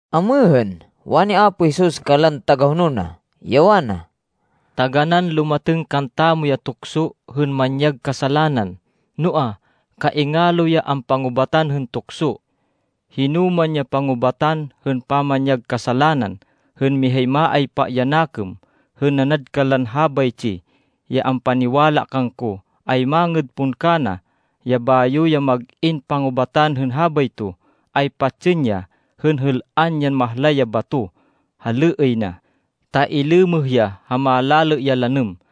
Amêhên, wani Apo Jesus kanlan tagahonol na, ya wana, “Taganán lumatêng kantamo ya tukso hên manyag kasalanan, noa, kaingalo ya ampangubatan hên tukso. Hinoman ya pangubatan hên pamanyag kasalanan hên mihay maaypa ya nakêm hên nanad kanlan habaytsi ya ampaniwala kangko, ay mangêd pon kana, ya bayo ya mag-in pangubatan hên habayto, ay patsên ya hên êl-an yan mahlay ya bato ha lêêy na, ta ilêmêh ya ha malalê ya lanêm.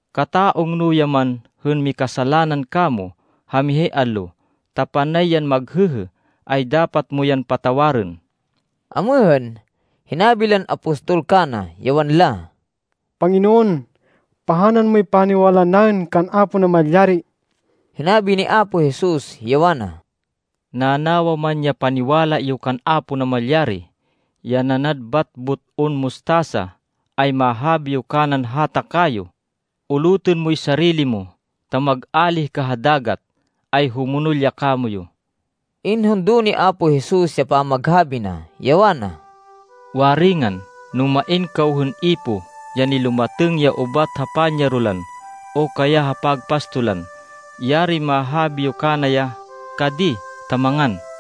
Kata-ungno ya man hên mikasalanan kamo, ha mihay allo, ta panay yan maghêhê, ay dapat mo yan patawarên.” Amêhên, hinabi lan apostol kana, ya wanla, “Panginoon, pahanan moy paniwala naên kan Apo Namalyari.” Hinabi ni Apo Jesus, ya wana, “Nanawa man ya paniwala yo kan Apo Namalyari, ya nanad bat but-on mustasa, ay mahabi yo kanan hata kayo, ‘Ulutên moy sarili mo, ta mag-álih ka ha dagat!’ ay humonol ya kamoyu.” Inhundo ni Apo Jesus ya pamaghabi na, ya wana, “Waringan, no main kaw hên ipoh ya nilumatêng ya ubat ha panyarolan o kaya ha pagpastolan, yarin mahabi yo kana ya, ‘Ka di, ta mangan!’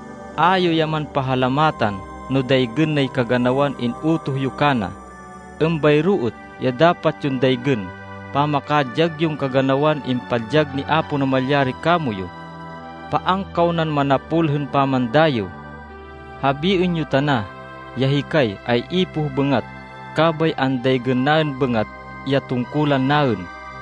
A yo ya man pahalamatan no daygên nay kaganawan in-utoh yo kana. Êmbayro êt ya dapat yon daygên pamakadyag yon kaganawan impadyag ni Apo Namalyari kamoyu. Paan kaw nan manapol hên pamandayêw. Habiên yo tana ya, ‘Hikay ay ipoh bêngat. Kabay andaygên naên bêngat ya tungkulan naên.’”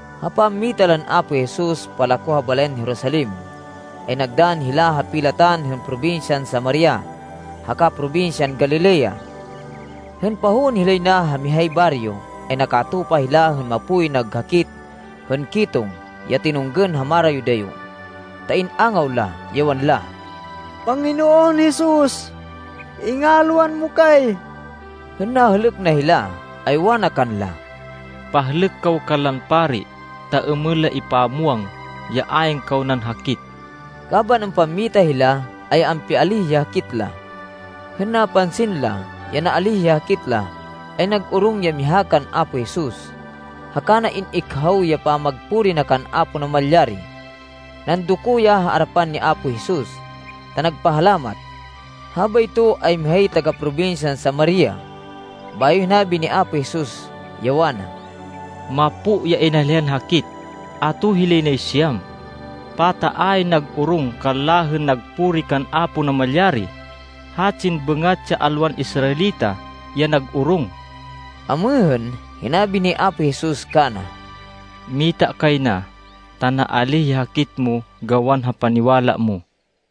Ha pammita lan Apo Jesus palako ha balayan Jerusalem, ay nagdann hila ha pilatan hên probinsyan Samaria haka probinsyan Galilea. Hên pahowên hilay na ha mihay baryo, ay nakatupa hila hên mapoy nag hakit hên ketong ya tinunggên ha marayo-dayo, ta in-angaw la, ya wanla, “Panginoon Jesus, ingalwan mo kay.” Hên nahêlêk na hila, ay wana kanla, “Pahlêk kaw kanlan pari ta êmên la ipamwang ya ayn kaw nan hakit.” Kaban ampammita hila, ay ampialíh ya hakit la. Hên napansin la, ya naalíh ya hakit la, ay nag-orong ya miha kan Apo Jesus, haka na in-ikhaw ya pamagpuri na kan Apo Namalyari. Nandoko ya ha arapan ni Apo Jesus, ta nagpahalamat. Habayto ay mihay taga-probinsyan Samaria. Bayo hinabi ni Apo Jesus, ya wana, “Mapo ya inalihan hakit. Ato hilay nay siyam? Pata ayn nag-orong kanla hên nagpuri kan Apo Namalyari? Hatsin bêngat ya alwan Israelita ya nag-orong.” Amêhên, hinabi ni Apo Jesus kana, “Mita kay na, ta naalíh ya hakit mo gawan ha paniwala mo.”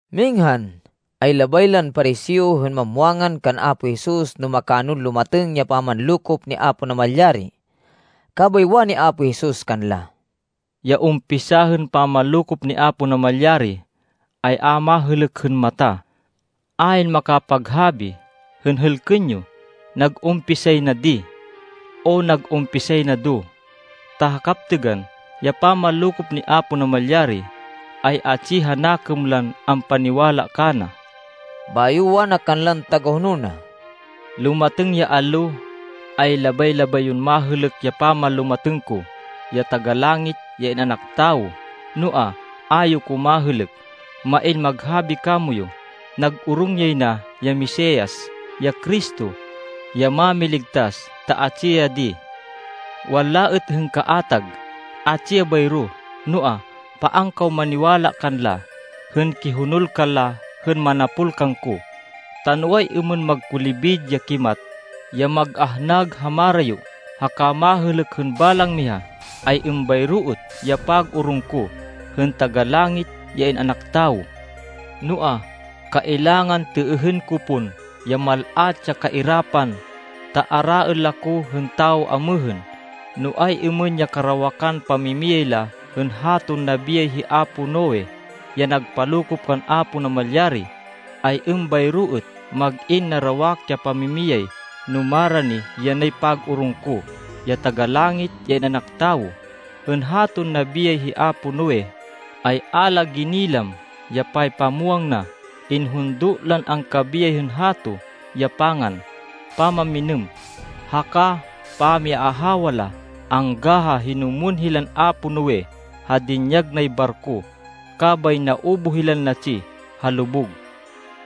Minghan, ay labay lan Pariseo hên mamwangan kan Apo Jesus no makanon lumatêng ya pamanlokop ni Apo Namalyari. Kabay wani Apo Jesus kanla, “Ya umpisa hên pamanlokop ni Apo Namalyari ay a mahêlêk hên mata. Ayn makapaghabi hên, ‘Hêlkên yo! Nag-umpisay na di!’ o ‘Nag-umpisay na do!’ Ta ha kaptêgan, ya pamanlokop ni Apo Namalyari ay atsi ha nakêm lan ampaniwala kana.” Bayo wana kanlan tagahonol na, “Lumatêng ya allo, ay labay-labay yon mahêlêk ya pamanlumatêng ko, ya Taga-Langit, ya In-anak Tawo. Noa, a yo ko mahêlêk. Main maghabi kamoyu, ‘Nag-orong yay na ya Mesias, ya Cristo, ya Mámiligtas ta atsi ya di!’ Wanla êt hên kaatag, ‘Atsi ya bayro!’ Noa, paan kaw maniwala kanla, hên kihonol kanla hên manapol kangko. Ta no ay-êmên magkulibid ya kimat, ya mag-ahnag ha marayo, haka mahêlêk hên balang miha, ay êmbayro êt ya pag-orong ko, hên Taga-Langit, ya In-anak Tawo. Noa, kailangan têêhên ko pon ya mal-at ya kairapan, ta araên la ko hên tawo amêhên. No ay-êmên ya karawakan pamimiyay la hên haton nabiyay hi apo Noe, ya nagpalokop kan Apo Namalyari, ay êmbayro êt mag-in narawak ya pamimiyay no marani yanay pag-orong ko, ya Taga-Langit, ya In-anak Tawo. Hên haton nabiyay hi apo Noe, ay a la ginilam ya paypamwang na. Inhundo lan angkabiyay hên hato ya pangan, pamamminêm, haka pamiaahawa la angga ha hinumwên hilan apo Noe ha dinyag nay barko. Kabay naubuh hilan natsi ha lubug.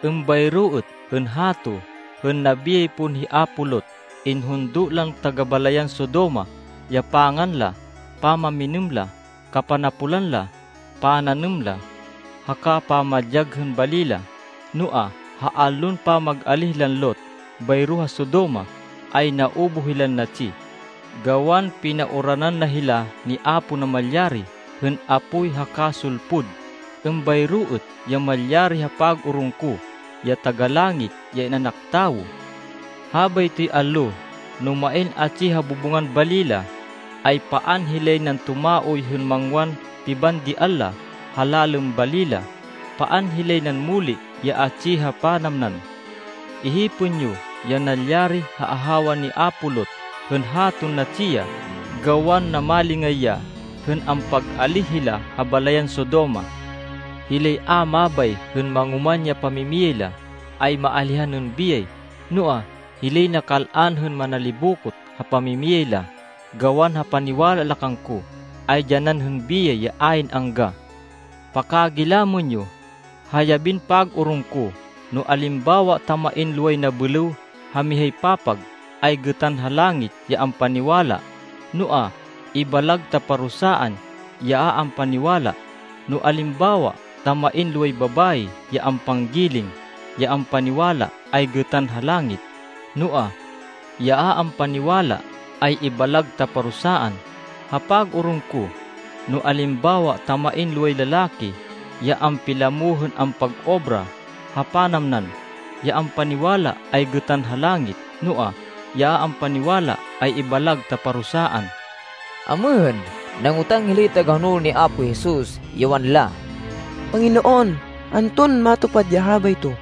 Êmbayro êt hên hato, hên nabiyay pon hi apo Lot. Inhundo lan taga-balayan Sodoma ya pangan la, pamamminêm la, kapanapolan la, pananêm la, haka pamadyag hên bali la. Noa, ha allon pamag-alíh lan Lot bayro ha Sodoma, ay naubuh hilan natsi, gawan pinauranan na hila ni Apo Namalyari hên apoy haka sulpud. Êmbayro êt ya malyari ha pag-orong ko, ya Taga-Langit, ya In-anak Tawo. “Habaytoy allo, no main atsi ha bubungan bali la, ay paan hilay nan tumaoy hên mangwan pibandian la ha lalên bali la. Paan hilay nan muli ya atsi ha panamnan. Ihipên yo ya nalyari ha ahawa ni apo Lot, hên haton natsi ya, gawan namalingay ya hên ampag-alíh hila ha balayan Sodoma. Hilay a mabay hên mangoman ya pamimiyay la, ay maalihan hên biyay. Noa, hilay nakal-an hên manalibokot ha pamimiyay la, gawan ha paniwala la kangko, ay dyanan hên biyay ya ayn angga. Pakagilamên yo, ha yabin pag-orong ko, no alimbawa ta main loway nabêlêw ha mihay papag, ay gêtan ha langit ya ampaniwala, noa, ibalag ta parusaan ya a ampaniwala. No alimbawa ta main loway babayi ya ampanggiling, ya ampaniwala ay gêtan ha langit, noa, ya a ampaniwala ay ibalag ta parusaan. Ha pag-orong ko, no alimbawa ta main loway lalaki ya ampilamo hên ampag-obra ha panamnan, ya ampaniwala ay gêtan ha langit, noa, ya a ampaniwala ay ibalag ta parusaan.” Amêhên, nangotang hilay tagahonol ni Apo Jesus, ya wanla, “Panginoon, anton matupad ya habayto?”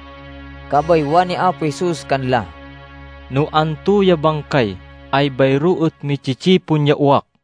Kabay wani Apo Jesus kanla, “No anto ya bangkay, ay bayro êt mi-tsi-tsipon ya uwak.”